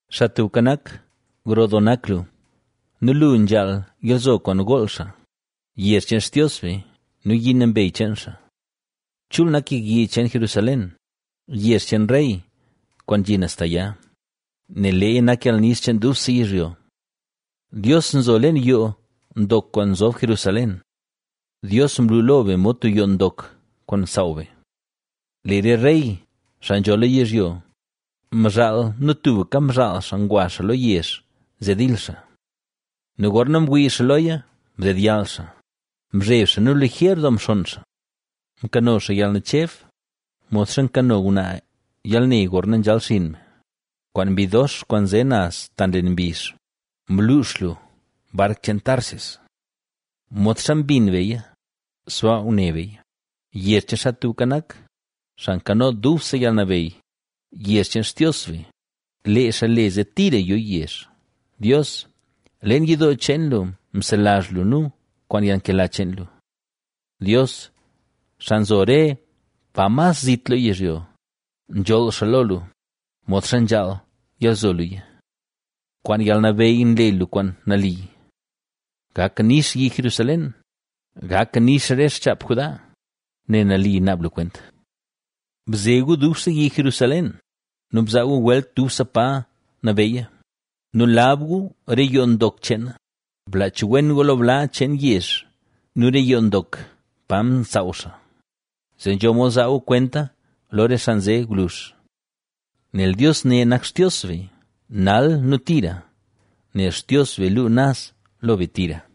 Xaa Tubka Nak, gro doo nak lu nu lu nzhaal yalzo kwaan gool xaa, yezh cheen Xtios be nu yi nambey cheen xaa. Chul nak yek yi cheen Jerusalén, yezh cheen rey, kwaan nzhi naz ta ya, nel leeya nak yalnix cheen dubse yizhyo. Dios nzo leen yoo ndok kwaan nzob Jerusalén; Dios mlu lo be mod tub yoo ndok kwaan nsaaw be. Lee re rey, xaa nzho lo yizhyo, mzhaal nu tubka mzhaal xaa ngwa xaa lo yezh zee dil xaa. Nu gorna mwii xaa loya mdedyall xaa, mzheb xaa nu liger doo mxonn xaa. Mkano xaa yalnacheb; modxa nkano ngwnaa yalne gorna nzhal xinn me, kwaan mbi dox kwaan nze naz ta nlen mbizh mluux lu bark cheen Tarsis. Modxa mbin beya, sbaa ngune beya, yezh cheen Xaa Tubka Nak, Xaa Nkano Dubse Yalnabeyy, yezh cheen Xtios be, ¡lee xaa le zee tira yo yezh! Dios, leen yidoo cheen lu mselazh nu kwaan yalnkela cheen lu. Dios, xaa nzo re pa mas zit lo yizhyo, nzholl xaa lo lu, modxa nzhaal yalzo luya. Kwaan yalnabeyy nle lu kwaan nali. Gak nix yi Jerusalén; gak nix re xchaap Judá, nel nali naab lu kwent. Bze gu dubse yi Jerusalén nu bzaa gu welt dubse pa nabeyya nu lab gu re yoo ndok cheen na; blaach wen gu lo bla cheen yezh nu re yoo ndok pa nsaaw xaa, zee nzho mod zaa gu kwenta lo re xaa nze gwluzh. Nel Dios ne nak Xtios be, nal nu tira, nel Xtios be luu naz lo be tira.